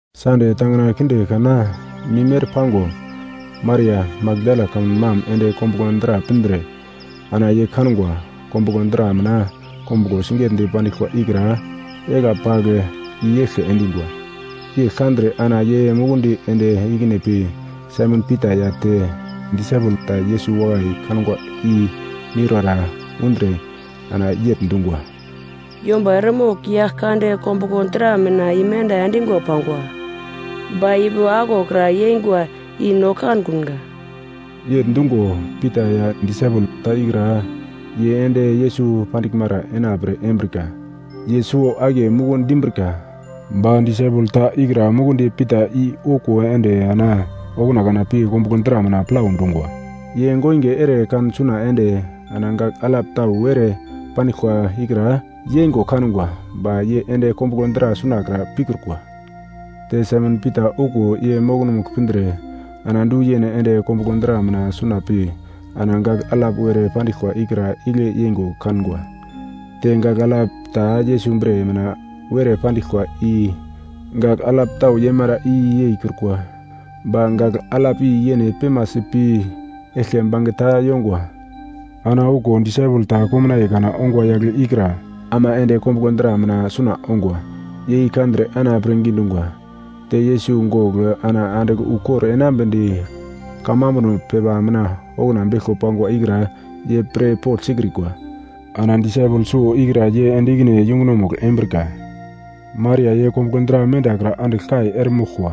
Sande tangina kinde kana mim ere pango, Maria, Makdala kamun mam ende kombuglo dra pindre ana ye kangwa, kombuglo dra mina kombuglo sigetdi pandiglkwa ikra egla pagl i-yeglke endingwa. Yegl kandre ana ye mukundi ende ikine pi Saimon Pita ya te disaipel ta Yesus wakai kangwa i miurara undre ana yegl dungwa, “Yomba eremogl Yaglkande kombuglo dra mina imenda endingwa pangwa, ba ipi aglokra yeingwa i no kankunga!” Yegl dungo Pita ya disaipel ta ikra, ye ende Yesus pandiglmara ena pre embrika. Ye suwo-akiye muku dimbrika, ba disaipel ta ikra mukundi Pita i okuwo ende ana okuna kana pi kombuglo dra mina plau dungwa. Ye goinge ere kan suna ende ana gagl alap tau were pandiglkwa ikra yeingo kangwa, ba ye ende kombuglo dra sunakra pikrukwa. Te Saimon Pita okuwo ye mokomugl pindre ana du yene ende kombuglo dra mina suna pi ana gagl alap were pandiglkwa ikra igle yeingo kangwa. Te gagl alap ta Yesus bre mina were pandiglkwa i gagl alap tau yeimara i yeikrukwa, ba gagl alap i yene pemasi pi eglke bangeta yongwa. Ana okuwo disaipel ta komnaiye kana ongwa yagle ikra ama ende kombuglo dra mina suna ongwa. Ye i kandre ana pirngi dungwa. Te Yesus gogl ana andigl ukor enambedi kamambuno pepa mina okuna beglko pangwa ikra ye pirpogl sikrikwa. Ana disaipel suwo ikra ye ende ikine yungunomugl embrika. Maria ye kombuglo dra mendakra andigl kai eremoglkwa.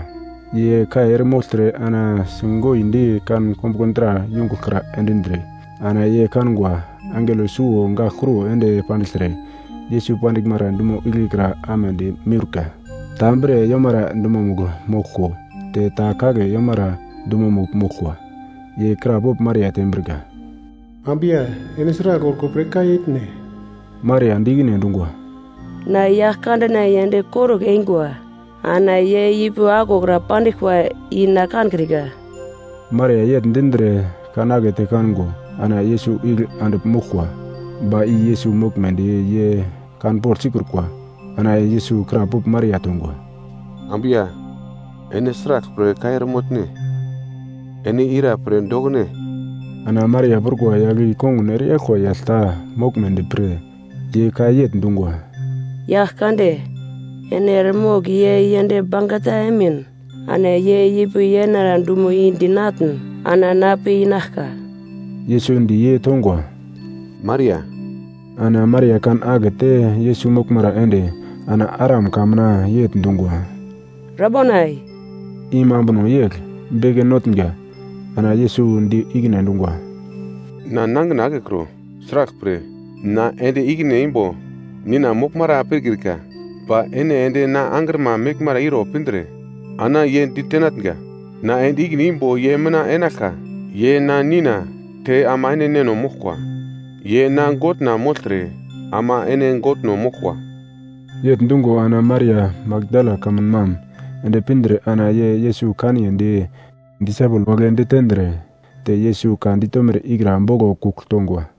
Ye kai eremogltre ana si goindi kan kombuglo dra yungugl kra endindre, ana ye kangwa angelo suwo gagl kruwo ende pandigltre, Yesus pandiglmara dumo igle kra amedi miurka, ta bre yomara dumomugl moglko te ta kagle yomara dumomugl moglkwa. Ye krapogl Maria tembrika, “Ambu ya, ene sragl orko pre kai etne?” Maria di ikine endungwa, “Na Yaglkandena yend korugl eingwa, ana ye ipi aglokra pandiglkwa i na kankrika!” Maria yegl dindre kan akete kango, ana Yesus igle andigl moglkwa, ba i Yesus moglmedi ye kanpogl sikrukwa. Ana Yesus krapogl Maria tongwa, “Ambu ya, ene sraglpre kai eremotne? Ene ira pre dokune?” Ana Maria prukwa yagl i kongun ereyaglkwa yagl ta moglmedi pre, ye ka yegl dungwa, “Yagl kande, ene eremogl ye yend bangeta emin, ana ye ipi yenara dumo i dinatn ana na pi inaglka.” Yesus di ye tongwa, “Maria!” Ana Maria kan akete Yesus moglmara ende ana Aram ka mina yegl dungwa, “Rabonai!” I mambuno yegl, “Beke Notnga”. Ana Yesus di ikine endungwa, “Na nangina akekro, sraglpre na ende ikine imbo Nina moglmara pikrika. Ba ene ende na angrima meglmara iro pindre ana ye ditenatnga, na ende ikine imbo ye mina enaglka, ye na Nina te ama ene Neno moglkwa, ye na Godna mogltre ama ene Godno moglkwa.” Yegl dungo ana Maria, Makdala kamun mam, ende pindre ana ye Yesus kanyedi disaipel wagle ditendre te Yesus ka ditomere ikra boglo kugl tongwa.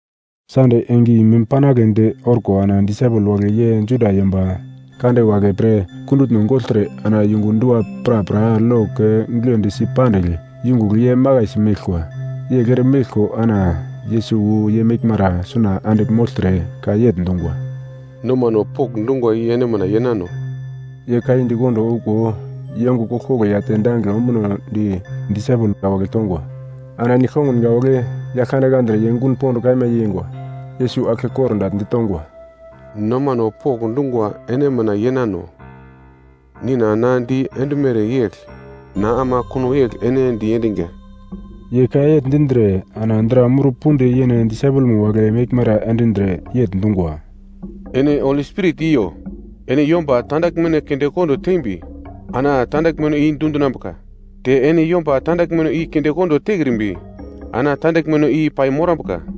Sande enge i mim panagledi orko ana disaipel wagle ye Juda yomba kande wagle pre kundutno gogltre ana yungu dua prapra lok giglendi si pandigl yungugl ye makaisi meglkwa. Yegl ere meglko ana Yesus wu ye meglmara suna andigl mogltre ka yegl dungwa, “Nomano pokndungwa i ene mina yenano.” Ye ka i di kondo okuwo, ye ongo koglkoglo ya te dangigle ombunodi disaipel wagle tongwa. Ana disaipel wagle Yaglkande kandre ye gun pond kaima yeingwa. Yesus aglke kordagl ditongwa, “Nomano pokndungwa ene mina yenano. Nina na di endumere yegl na ama kuno yegl ene diendinga.” Ye ka yegl dindre ana dra mur pudi yene disaipelma wagle meglmara endindre yegl dungwa, “Ene Holi Spirit iyo. Ene yomba tandaglmeno kindekondo tembi ana tandaglmeno i dundinambuka. Te ene yomba tandaglmeno i kindekondo tekrimbi ana tandaglmeno i pai morambuka.”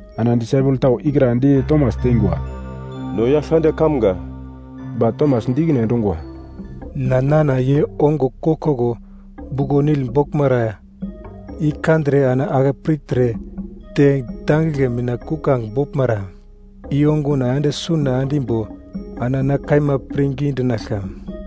Ana disaipel tau ikra di Tomas teingwa, “No Yaglkande kamga!” Ba Tomas di ikine endungwa, “Na nana ye ongo koglkoglo buglo-nil boglmara i kandre ana ake pirtre te dangigle mina kuglange boglmara i onguna ende suna endimbo, ana na kaima pirngi dinaglka.”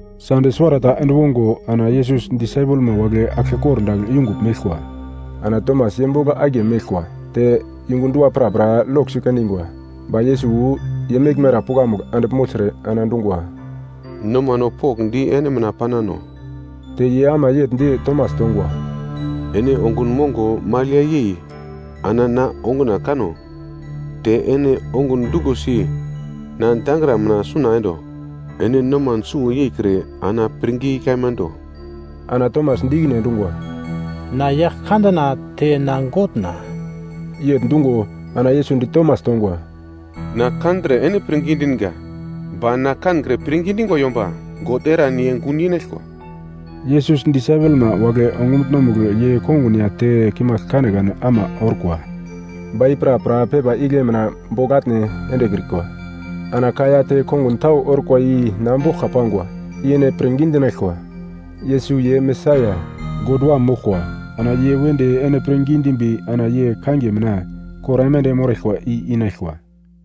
Sande suwarata ende wongo ana Yesus disaipelma wagle aglke kordagl yungugl meglkwa. Ana Tomas ye bogl akiye meglkwa. Te yungu dua prapra lok sikendingwa, ba Yesus wu ye meglmara pukamugl andigl mogltre ana dungwa, “Nomano pokndi ene mina panano.” Te ye ama yegl di Tomas tongwa, “Ene ongun mongo magl ya yei ana na onguna kano, te ene ongun duglosi na dangra mina suna endo. Ene noman suwo yeikre ana pirngi kaima do!” Ana Tomas di ikine endungwa, “Na Yaglkandena te na Godna!” Yegl dungo, ana Yesus di Tomas tongwa, “Na kandre ene pirngi dinga. Ba na kankre pirngi dingwa yomba God eran ye gun yenaglkwa!” Yesus disaipelma wagle ongumutno-mugl ye kongun ya te kimagl kanekane ama orkwa. Ba i prapra pepa igle mina bogl atne endekrikwa. Ana ka ya te kongun tau orkwa i na boglka pangwa, i ene pirngi dinaglkwa. Yesus ye Mesaia, God Wam moglkwa. Ana ye wedi ene pirngi dimbi ana ye kangiye mina, kor aimande moraglkwa i inaglkwa.